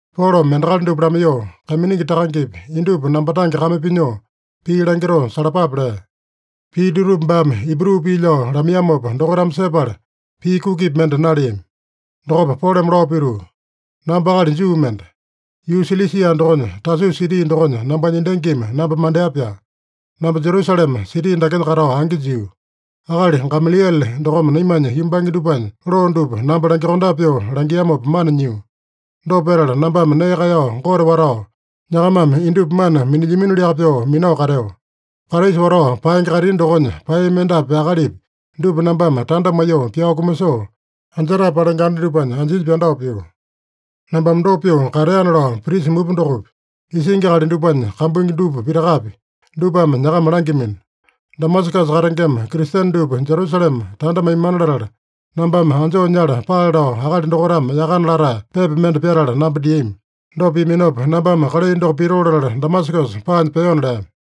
Polome endakali dupa lamaiyoo, “Kaiminingi takangepi, indupa namba tange kame pinyoo pii langitoo salapape” lea. Pii dutupa baame Ibru pii lao lamaiyamopa dokaitame sepala, pii kukipi mende naleami. Dokopa Polome lao pituu, “Namba akali Juu mende. Yuu Silisia dokonya, Tasusa siti dokonya nambanya endangimi namba mandea-pyaa. Namba Jerusalema siti dakenya katao angi jio. Akali Gamaliele dokome naimanya yumbange dupanya loo dupa namba langyokondape pyoo langiamopa mana nyio. Dopa petala nambame nee kaeyao Gote watao, nyakamame indupa mana minilyaminoliaka pyoo minao kateo. Kraisa watao paenge kaitini dokonya paeyami endapi akalipi dupa nambame tanda maiyoo pyao kumasoo, anjetae palenge anda dupanya anjinya pyandao pio. Nambame dopa pyoo kateana lao prisa mupa dokopi, isingi akali dupanya kambuingi dupa pitakapi, dupame nyakama langyamino. Damasakasa katengema Kristene dupa Jerusalema tanda maimana latala, nambame anjoo nyala paale lao akali dokaitame yakana latae pepa mende pyatala namba diami. Dopa piaminopa, nambame kalai doko pitoo latala Damasakasa paanya peona” lea.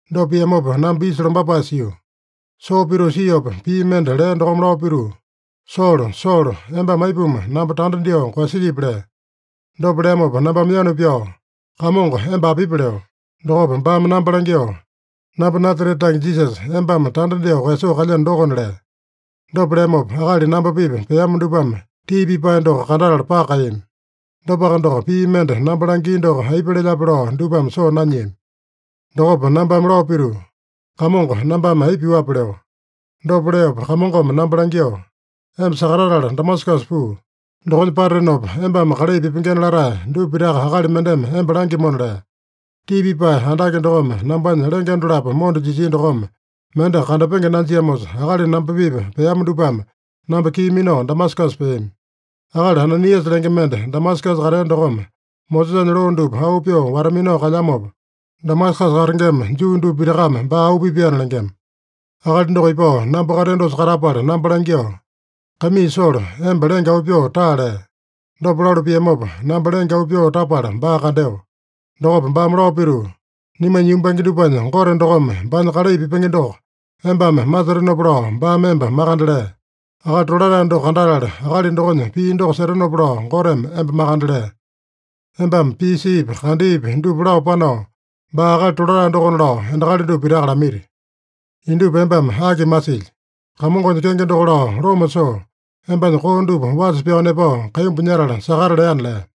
Dopa piamopa namba isa lombapae sio. Soo pituu siopa pii mende lea dokome lao pituu, ‘Solo, Solo, embame aipuma namba tanda dyoo koeyasilyipi?’ lea. Dopa leamopa nambame yanu pyao, ‘Kamongo, emba apipi?’ leo. Dokopa baame namba langyoo, ‘Namba Nasarete tange Jisasa, embame tanda dyoo koeyasoo kalyeno dokona’ lea. Dopa leamopa, akali namba-pipa peama dupame tii pipae doko kandatala paka kaeyami. Dopaka doko, pii mende namba langia doko aipa lelyape lao dupame soo nanyiami. Dokopa nambame lao pituu, ‘Kamongo, nambame aipa pyuape?’ leo. Dopa leopa Kamongome namba langyoo, ‘Emba sakatatala Damasakasa puu. Dokonya patatenopa, embame kalai pipengena latae dupa pitaka akali mendeme emba langyamona’ lea. Tii pipae andake dokome nambanya lenge dolapo monda jisia dokome mende kandapenge nanjiamosa, akali namba-pipa peama dupame namba kii minao Damasakasa peami. “Akali Ananiasa lenge mende, Damasakasa katea dokome Mosesanya loo dupa auu pyoo wata-minao kalyamopa, Damasakasa katengema Juu dupa pitakame baa auu pipaena lengema. Akali doko ipao namba kateo dosa katapala namba langyoo, ‘Kaimii Solo, emba lenge auu pyoo taa’ lea. Dopa lalu piamopa, namba lenge auu pyoo tapala baa kandeo. Dokopa baame lao pituu, ‘Naimanya yumbange dupanya Gote dokome baanya kalai pipenge doko embame masetenopa lao baame emba makande lea. Akali Tolatae doko kandatala, akali dokonya pii doko setenopa lao Goteme emba makande lea. Embame pii siipi, kandeepi dupa lao panao, baa Akali Tolatae dokona lao endakali dupa pitaka lamaiti. Indupa embame aki malisilyi? Kamongonya kenge doko lao loma soo, embanya koo dupa wasa pyao nepao, kaimbu nyatale sakata’ leana” lea.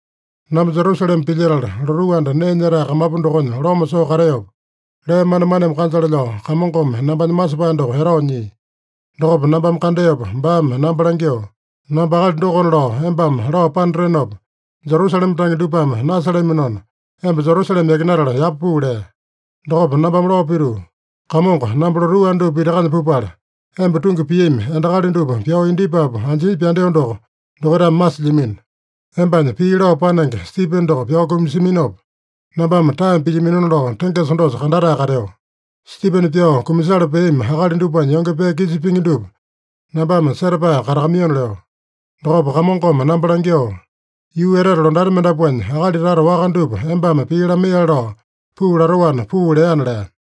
“Namba Jerusalema pilyetala, lotuu anda nee nyetae kamapu dokonya loma soo kateopa, lee manemaneme kanjale lao Kamongome nambanya masepae doko etao nyia. Dokopa nambame kandeopa baame namba langyoo, ‘Namba akali dokona lao embame lao panatenopa, Jerusalema tange dupame nasalaminona, emba Jerusalema yakinatala yapa puu’ lea. Dokopa nambame lao pituu, ‘Kamongo, namba lotuu anda dupa pitakanya pupala, emba tungi piami endakali dupa pyao indyepapu anjinya pyandeo doko dokaitame masilyamino. Embanya pii lao panenge, Stipene doko pyao kumasiaminopa, nambame taeme pilyaminona lao tengesa dosa kandatae kateo. Stipene pyao kumasala peami akali dupanya yonge pee kisa pingi dupa nambame setapae katakamaiyona’ leo. Dokopa Kamongome namba langyoo, ‘Yuu etete londati mendapuanya akali tata waka dupa embame pii lamaiyale lao puu latoana puu’ leana” lea.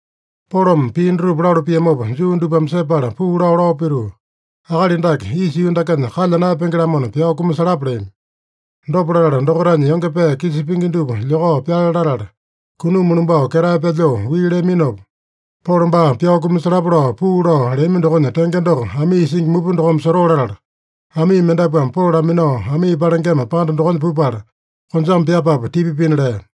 Polome pii dutupa lalu piamopa Juu dupame sepala puu lao, lao pituu, “Akali dake isa yuu dakenya kalya naeyapenge-lamona, pyao kumasalapa” leami. Dopa latala dokaitanya yonge pee kisa pingi dupa lyokao pyale latala, kunuma lumbao ketae pyalyoo wii leaminopa, Polo baa pyao kumasalapa lao puu lao leami dokonya tenge doko amii isingi mupa dokome sotoo latala, amii mendapuame Polo laminao, amii palengema panda dokonya pupala, konjame pyapapu tipa pina lea.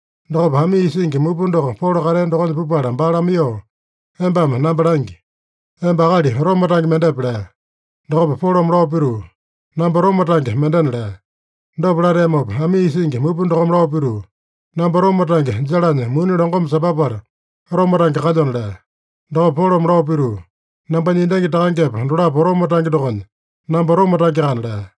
Dokopa amii isingi mupa doko Polo katea dokonya pupala baa lamaiyoo, “Embame namba langi: Emba akali Roma tange mendepe?” lea. Dokopa Polome lao pituu, “Namba Roma tange mendena” lea. Dopa lateamopa, amii isingi mupa dokome lao pituu, “Namba Roma tange jalanya muni longome sambapala, Roma tange kalyona” lea. Dokopa Polome lao pituu, “Nambanya endangi takangepa dolapo Roma tange dokonya, namba Roma tangeakana” lea.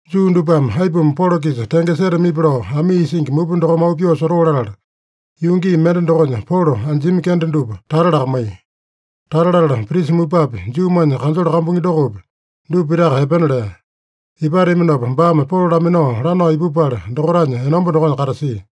Juu dupame aipuma Polo-kisa tenge setamipi lao amii isingi mupa dokome auu pyoo sotoo latala, yuu gii mende dokonya Polo anjiami kende dupa tata lakamaiya. Tata latala prisa mupapi, Juumanya kanjole kambuingi dokopi, dupa pitaka epena lea. Ipateaminopa baame Polo laminao lanao ipupala, dokaitanya enomba dokonya katasia.